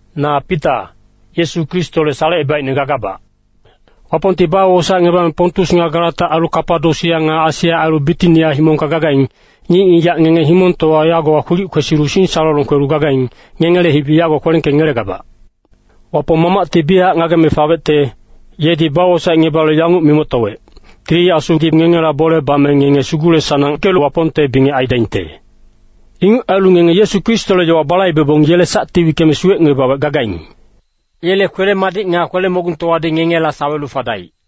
Na Pita, Yesu Kristole salecebaicne gagabac. Wapongti bawosaecngebame Pontus nga Galata ailu Kapadosia nga Asia ailu Bitinia himongka gagaing, ngic-ngigac ngenge himongtowa yagowa kwilic kwesilu singsalolong kwelu gagaing, ngengele hibi yago kwelengkengelegabac. Wapong Mamacti biyachac ngageme fawecte, yedi bawosaecngebalu yanguc mimoctowec, Tili Asudi ngengela bole bame ngenge sugule-sanangkelu Wapongte bingec aidaingte. Inguc ailu ngenge Yesu Kristole yowa balaibebong, yele sacti wickeme suwecngebawec gagaing. Yele kwele-madic nga kwele-mogungtowadi ngengela sawelu fadaic.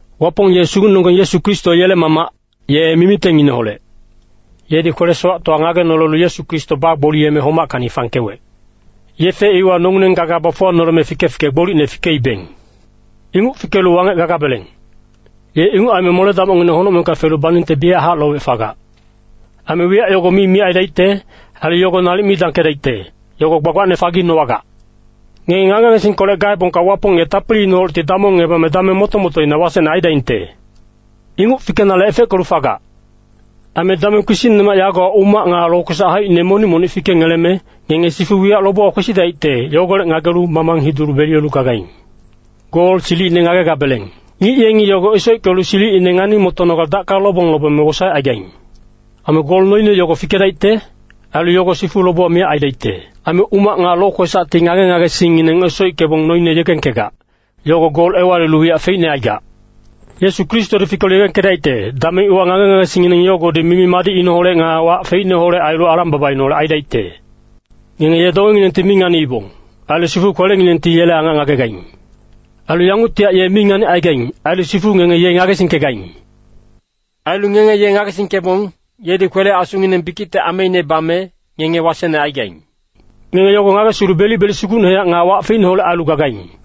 Wapong ye Sugucnenonggeng Yesu Kristo yele Mamac, ye mimitengineholec. Yedi kwele-sowactowa ngagenolelu Yesu Kristo bagboliyeme homackacni fangkewec. Yefe iwa nongileng gaga bafuwanoleme fike-fike gbolicne fikeibeng. Inguc fikelu wangec gagabeleng. Ye inguc aime mole-damocngineng honocmengka felu baningte biyachac lowec fagac. Aime wiyac yogo mi miyac aidaicte. Ailu yogo nalic mi dangkedaicte, yogo gbagbacne faginowagac. Ngenge ngage-ngagesingkolec gaebongka Wapong ye tapiliineholecti damongngebame dameng moto-motoina wasecne aidaingte. Inguc fikenale efeckelu fagac. Aime dameng kpisicnemac yagowa umac nga lokwesac haicine monic-monic fikengeleme, ngenge sifu wiyac lobewa kwesidaicte, yogolec ngagelu mamang hidulu beliyelu gagaing. Gol silicine ngagegabeleng. Ngic yengi yogo esoickelu silicine ngani-motonogale dacka lobong lobeme wosaecaigaing. Aime gol noine yogo fikedaicte. Ailu yogo sifu lobewa miyac aidaicte. Aime umac nga lokwesacti ngage-ngagesingngineng esoickebong noine yegengkegac, yogo gol ewalilu wiyac feicne aigac. Yesu Kristodi fikelu yegengkedaicte, dameng iwa ngage-ngagesingngineng yogodi mimi-madicneholec nga wac feicneholec ailu alang-babaineholec aidaicte. Ngenge ye dongenginengti mi nganiibong. Ailu sifu kwelenginengti yele angac ngagegaing. Ailu yanguctihac ye mi nganicaigaing. Ailu sifu ngenge ye ngagesingkegaing. Ailu ngenge ye ngagesingkebong, yedi kwele-asunginang bikicte ameine bame, ngenge wasecne aigaing. Ngenge yogo ngagesilu belic-belic sugucnehac nga wac feicneholec ailu gagaing.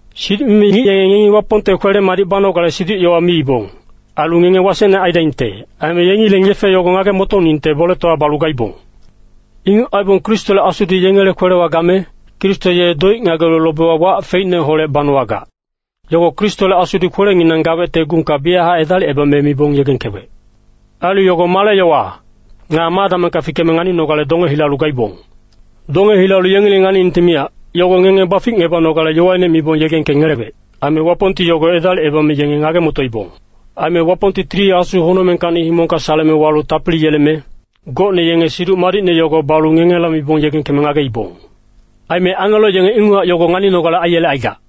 Siduc-mimi ngic yenge ngengi Wapongte kwele-madic banogale siduc-yowa miibong. Ailu ngenge wasecne aidaingte. Aime yengileng yefe yogo ngage-motoningte boletowa balu gaibong. Inguc aibong Kristole Asudi yengele kwelewa game, Kristo ye doic ngagelu lobewa wac feicneholec banowagac, yogo Kristole Asudi kwelenginang gawecte gungka biyachac edalicebame mibong yegengkewec. Ailu yogo male yowa, nga ma damengka fikeme nganinogale donge hilalu gaibong. Donge hilalu yengileng nganiningte miyac, yogo ngenge baficngebanogale yowaine mibong yegengkengelewec. Aime Wapongti yogo edalicebame yenge ngage-motoibong. Aime Wapongti Tili Asu honocmengkacni himongka saleme walu tapili yeleme, gocne yenge Siduc Madicne yogo balu ngengela mibong yegengkeme ngageibong. Aime angelo yenge inguchac yogo nganinogale aiyelecaigac.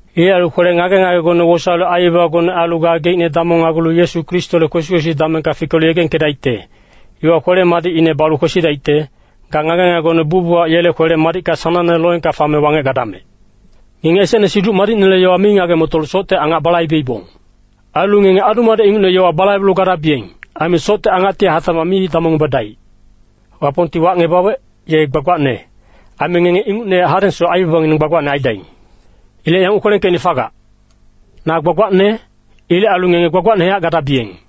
Ilec ailu kwele ngage-ngagegone wosaelu aibabagone ailu gageicne damongnagulu Yesu Kristole kwesi-kwesi damengka fikelu yegengkedaicte, iwa kwele-madicine balu kwesidaicte. Ga ngage-ngagegone bucbuchac yele kwele-madicka sanangne loengka fame wangec gadamec. Ngenge esecne Siduc Madicnele yowa mi ngage-motolu socte angac balaibeibong. Ailu ngenge adu-madec ingucne yowa balaibelu gadabiyeng. Aime socte angacti hatacmac mi damongngebadaic. Wapongti wacngebawec, ye gbagbacne, aime ngenge ingucnehac hadengsoc aibabangineng gbagbacne aidaing. Ilec yanguc kwelengkeicne fagac, “Na gbagbacne. Ilec ailu ngenge gbagbacnehac gadabiyeng.”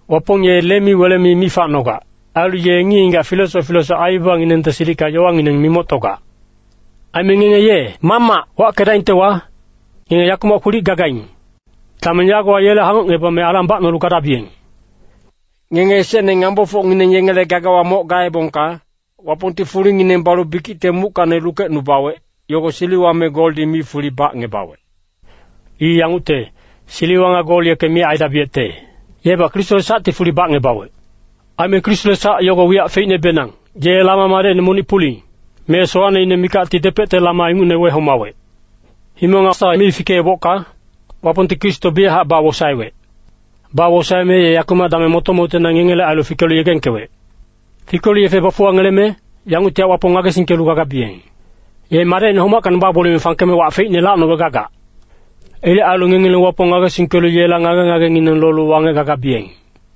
Wapong ye lemi-welemi mi facnogac. Ailu ye ngic-ngigac filesoc filesoc aibabanginengte silicka yowangineng mimoctogac. Aime ngenge ye “Mamac” wackedaingtewa, ngenge yakumac kwilic gagaing, dameng yagowa yele hangocngebame alang bacnolu gadabiyeng. Ngenge esecne ngambofocngineng yengele gagawa moc gaebongka, Wapongti fulingineng balu bikicte muckacni lukecnubawec, yogo siliwa me goldi mi fuli bacngebawec. I yangucte, siliwa nga gol yeke miyac aidabiyecte. Yebac Kristole sacti fuli bacngebawec. Aime Kristole sac yogo wiyac feicnebenang, ye lama madecine monic puling, me sowacneine mikacti depecte lama ingucne wehomawec. Himong nga sawa mi fikeebocka, Wapongti Kristo biyachac bawosaewec. Bawosaeme ye yakumac dameng moto-motoina ngengele ailu fikelu yegengkewec. Fikelu yefe bafuwangeleme, yanguctihac Wapong ngagesingkelu gagabiyeng. Ye Madecine homackacni bagboliyeme fangkeme wac feicne lacnowec gagac. Ilec ailu ngengileng Wapong ngagesingkelu yela ngage-ngagengineng lolu wangec gagabiyeng.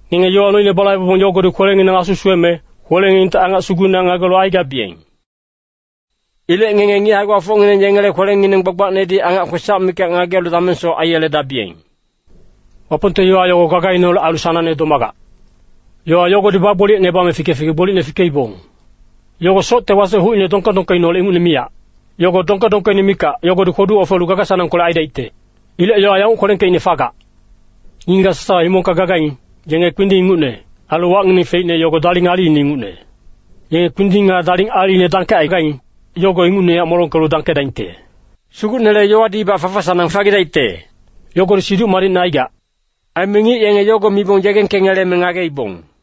Ngenge yowa noine balaibebong yogodi kwelenginang suweme, kwelenginengti angac sugucnehac ngagelu aigabiyeng. Ilec ngenge ngic hae-gbafocngineng yengele kwelengineng gbagbacnedi angac kwesac mikac ngagelu damengsoc aiyeledabiyeng. Wapongte yowa yogo gagaineholec ailu sanangne domagac. Yowa yogodi bagboliyecngebame fike-fike gbolicne fikeibong. Yogo socte wasec hucine dongke-dongkeineholec ingucne miyac. Yogo dongke-dongkeine mikac, yogodi kwodu ofelu gaga-sanangkolec aidaicte. Ilec yowa yanguc kwelengkeicne fagac, “Ngic-ngigac sasawa himongka gagaing, yenge kpinding ingucne. Ailu wacngineng feicne yogo daling aliine ingucne. Yenge kpinding nga daling aliine dangkecaigaing, yogo ingucnehac molongkelu dangkedaingte. Sugucnele yowadibac fafa-sanang fagidaicte.” Yogodi Siduc Madicne aigac. Aime ngic yenge yogo mibong yegengkengeleme ngageibong.